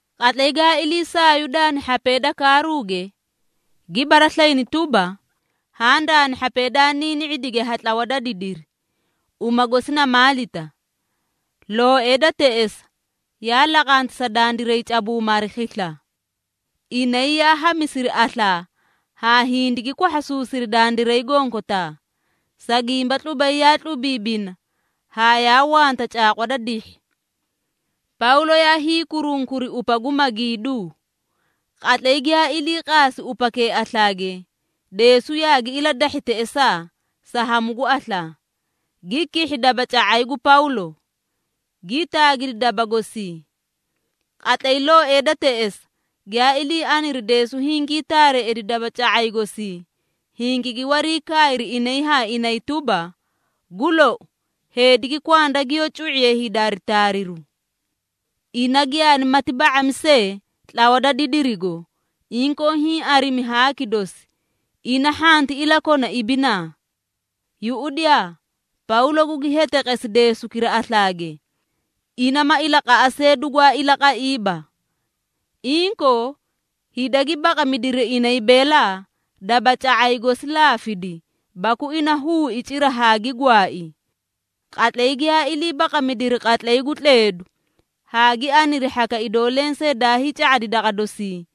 Qatlay gaa ilii saayu daani hhapee da kaaruuge, gi baraslayini tuba, haã daani hhapee daa niini⁄idige ha tlawa da didiri, uma gosi na Maalita. Looee da teꞌesa yaa laqanti sa dandiray cabuuma hari khisla. Inay yaa hamisiri aslaa haa hindigi kwahhasuusiri dandiray gonkotaa, sa gimba tlubay yaa tlubiibina haa yaa wanta caaqwa da dihhi. Pawlo yaa hiikurunkuri upa gu magiiduu. Qatlay giyaa ilii qaasi upakee aslaage, deesu yaagi iladahhi teꞌesaa sa hamu gu aslaa, gi kihhi dabaca⁄ay gu Pawlo, gii taagidi daba gosii. Qatlay looetee da teꞌesa giyaa ilii aniri deesu hingii taareeꞌedi dabaca⁄ay gosii, hingigi wariikaayri inay haa inay tuba, “Gu lou, heediki kwanda giyoó cu⁄iye hida hari taariru. Ina giyaanimati ba⁄ami see tlawa da didirigo, inkoo hiĩ arimi haaki dosi, ina hhanti ilakona ibinaa.” Yuꞌudiyaa, Pawlo gugi heteqesi deesukira aslaage, ina ma ilaqaꞌa see dugwaa ilaqaiiba. Inkoo, hida gi baqamidiri inay beelaa dabaca⁄ay gosi laafidi baku ina huui cira haa gi gwaai. Qatlay giyaa ilii baqamidiri qatlay gu tleedu haa gi aniri hhaka idoo lensee daa hiica⁄adi daqa dosii,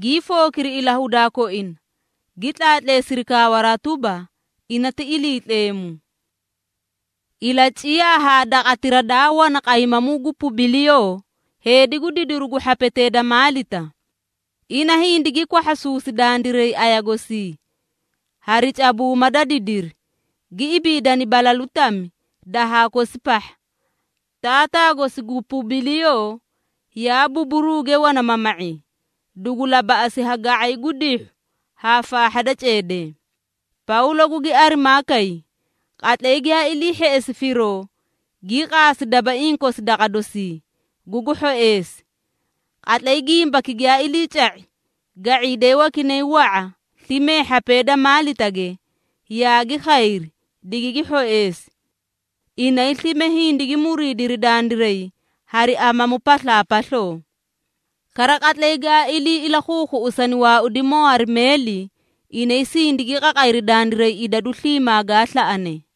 gii fookiri ilahudaa koina, gi tlaatleesiri kawaraa tuba, ina ti iliitleemu. Ilaciyaa haa daqatira daa wana qaymamuu gu Pubiliyoo, heedi gu didiru gu hhapetee da Maalita. Ina hindigi kwahhasuusi dandiray aya gosii hari cabuuma da didiri, gi ibiidani balalu tami dahaa kosi pahha. Taataa gosi gu Pubiliyoo yaa buburuge wana mama⁄i, dugu labaꞌasi ha ga⁄ay gu dihhu haa faahha da ceedee. Pawlo gugi arimaa kay. Qatlay giyaa ilii hheꞌesi firoo, gii qaasi dabaiĩ kosi daqa dosii, gugu hhoeesi. Qatlay gimbaki giyaa iliica⁄i, ga⁄iidee wakinay wa⁄a slime hhapee da Maalitage, yaagi khayri, digigi hhoeesi. Inay slime hindigi muriidiri dandiray hari amamu paslaapasloo. Kara qatlay gaa ilii ilakhuukhuꞌusani waaudimoo hari meeli, inay sindigi qaqayri dandiray idadu sliimaa gaa slaꞌane.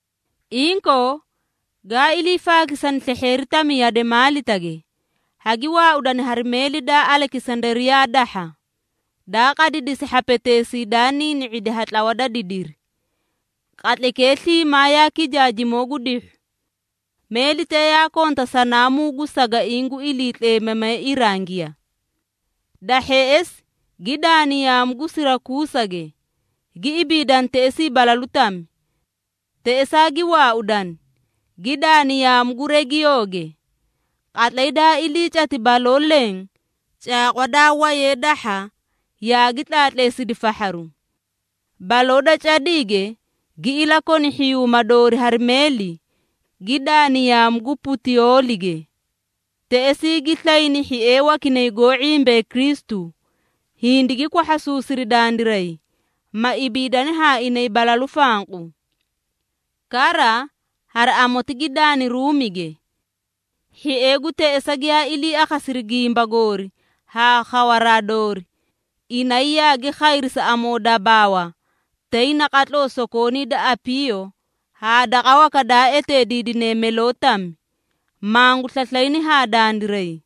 Inkoo, gaa iliifaakisani slehheeri tami yade Maalitage, hagi waaudani hari meeli daa Alekisandariyaa dahha, daa qadidisi hhapeteesii daa niini⁄idi ha tlawa da didiri. Qatlaykee sliimaa yaa kijaajimoo gu dihhu. Meelitee yaa konta sanaamuu gu sagaiĩ gu iliitleemamee irangiya. Da hheꞌesi gi daani yaamu gu Sirakuusage, gi ibiidani teꞌesii balalu tami. Teꞌesaa gi waaudani, gi daani yaamu gu Regiyooge. Qatlay daa ilii cati baloo leẽ caaqwa daa wayee dahha yaagi tlaatleesidi fahharu. Baloo da cadiige gi ilakoni hhiyuuma doori hari meeli, gi daani yaamu gu Putiyoolige. Teꞌesii gi slayni hhiee wakinay goó ⁄imbee Kristu, hindigi kwahhasuusiri dandiray, ma ibiidani haa inay balalu fanqu. Kara, hari amoti gi daani Ruumige. Hhiee gu teꞌesa giyaa ilii akhasiri gimba goori haa khawaraa doori, inay yaagi khayri sa amoodabaawa tay naqatloo Sokoonii da Apiiyo haa daqa waka daa eteediidine Meloo tami, mangu slaslayni haa dandiray.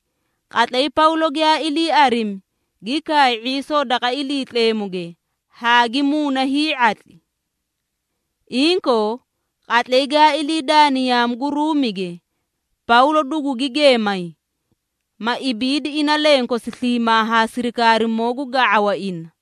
Qatlay Pawlo giyaa ilii arimi, gi kaay ⁄iisoo daqa Iliitleemuge haa gi muuna hii⁄atli. Inkoo, qatlay gaa ilii daani yaamu gu Ruumige, Pawlo dugugi geemay, ma ibiidi ina lenkosi sliimaa haa sirikaarimoo gu ga⁄awa ina.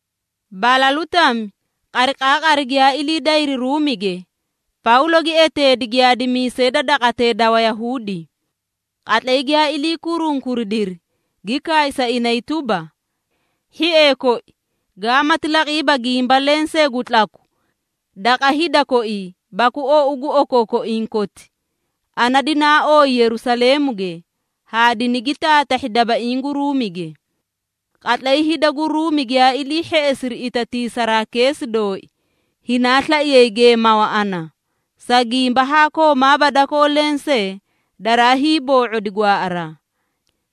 Balalu tami, qariqaaqari giyaa ilii dayri Ruumige, Pawlo gi eteedi giyaadimiisee da daqatee da Wayahuudi. Qatlay giyaa ilii kurunkuridiri, gi kaay sa inay tuba, “Hhiee koi, gaamati laqiiba gimba lensee gu tlaku daqa hida koii baku ou gu okookoiĩ koti, ana dinaa ooyi Yerusaleemuge haa dinigi taatahhi dabaiĩ gu Ruumige. Qatlay hida gu Ruumi giyaa ilii hheꞌesiri itatiisaraa keesi dooi, hinaa slaiyay geemawa ana, sa gimba haa koomaaba dakoo lensee daraa hiiboo⁄odi gwaaꞌaraa.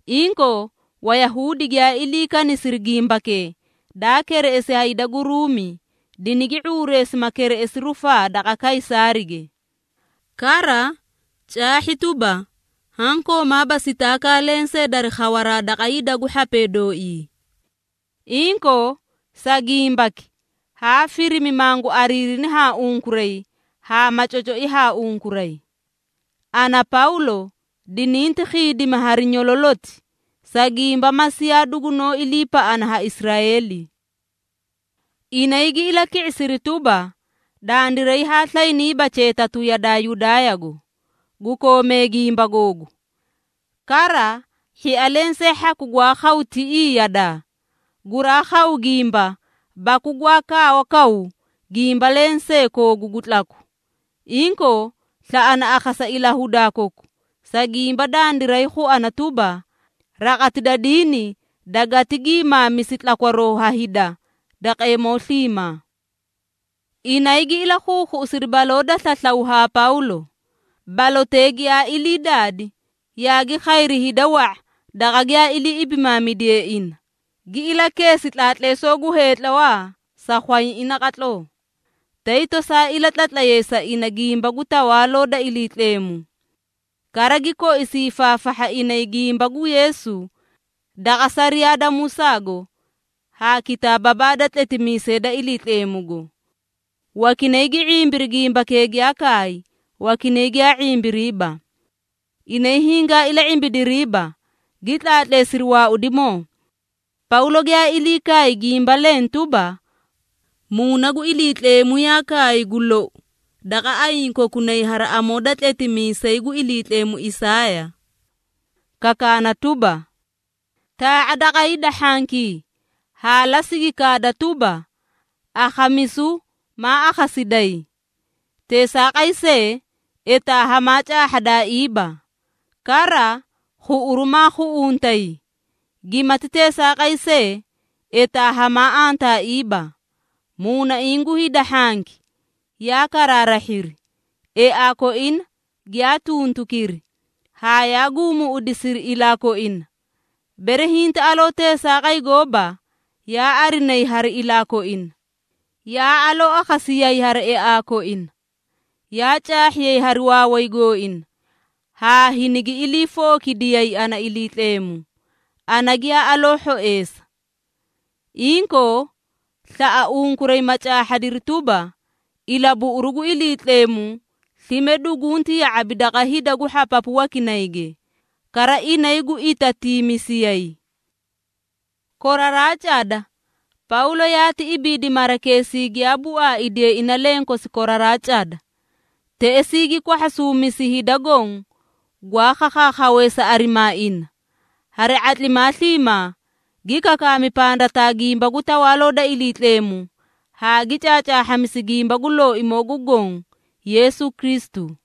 Inkoo, Wayahuudi giyaa ilii kanisiri gimbakee daa kereꞌesi ha hida gu Ruumi, dinigi ⁄uureesi ma kereꞌesi rufaa daqa Kaysaarige. Kara, caahhi tuba, haã koomaaba sitaakaa lensee dari khawaraa daqa hida gu hhapee dooii. Inkoo, sa gimbaki haa firimi mangu ariirini haa unkuray haa ma cocoi haa unkuray. Ana, Pawlo, dininti khiidimi hari nyololoti, sa gimba Masiiya dugunoó iliipaꞌana ha Israeeli.” Inay gi ilaki⁄isiri tuba, “Dandiray haa slayniiba cheetatu yadaa Yudaayago, gu koomee gimba googu. Kara, hhia lensee hhaku gwaa khaw tiꞌii yadaa, guraa khaw gimba baku gwaa kaawakaw gimba lensee koogu gu tlaku. Inkoo, slaꞌana akhasa ilahudaa koku, sa gimba dandiray khuana tuba, raqati da diini dagati gi maamisi tlakwaroo ha hida daqeemoo sliimaa.” Inay gi ilakhuukhuꞌusiri baloo da slaslaw haa Pawlo. Balotee giyaa ilii daadi, yaagi khayri hida wa⁄a daqa giyaa ilii ibimaamidiye ina. Gi ilakeesi tlaatleesoo gu heetlawaa sa khwayaiĩ naqatloo, tay tosaa ilatlatlay sa inay gimba gu Tawaaloo da Iliitleemu. Kara gi koisi hiifaafahha inay gimba gu Yeesu daqa sariyaa da Musaago haa kitaababaa da tletimiisee da Iliitleemugo. Wakinay gi ⁄imbiri gimbakee giyaa kaay, wakinay giyaa ⁄imbiriiba. Inay hingaa ila⁄ibidiriiba, gi tlaatleesiri waaudimoo, Pawlo giyaa ilii kaay gimba leẽ tuba, “Muuna gu Iliitleemu yaa kaay gu lou daqa ayiĩ kokunay hari amoo da tletimiisay gu Iliitleemu Isaaya, kakaana tuba, ‘Taa⁄a daqa hida hhankii haa lasigi kaada tuba, akhamisu maa akhasidayi, teesaaqay see, etaa hamaa caahhadaaiiba. Kara, khuꞌuru maa khuꞌuntay, gimati teesaaqay see, etaa hamaa antaaiiba. Muunaiĩ gu hida hhanki yaa karaarahhiri, eaa koina giyaa tuntukiri, haa yaa guumuuꞌudisiri ilaa koina, bere hinti aloo teesaaqay gooba, yaa arinayi hari ilaa koina, yaa aloo akhasiyayi hari eaa koina, yaa caahhiyay hari waaway gooina haa hinigi iliifookidiyay ana Iliitleemu, ana giyaa aloo hhoeesa.’ Inkoo, slaꞌa unkuray ma caahhadiri tuba, ilabuꞌuru gu Iliitleemu slime dugunti ya⁄abi daqa hida gu hhapapu wakinayge, kara inay gu itatiimisiyay.” Koraraa cada, Pawlo yaati ibiidi marakeesii giyaa buaaidiye ina lenkosi koraraa cada. Teꞌesii gi kwahhasuumisi hida goõ gwaa khakhaakhawee sa arimaa ina. Hari ⁄atlimaa sliimaa, gi kakaami pandataa gimba gu Tawaaloo da Iliitleemu haa gi caacaahhamisi gimba gu Looimoo gu Goõ Yeesu Kristu.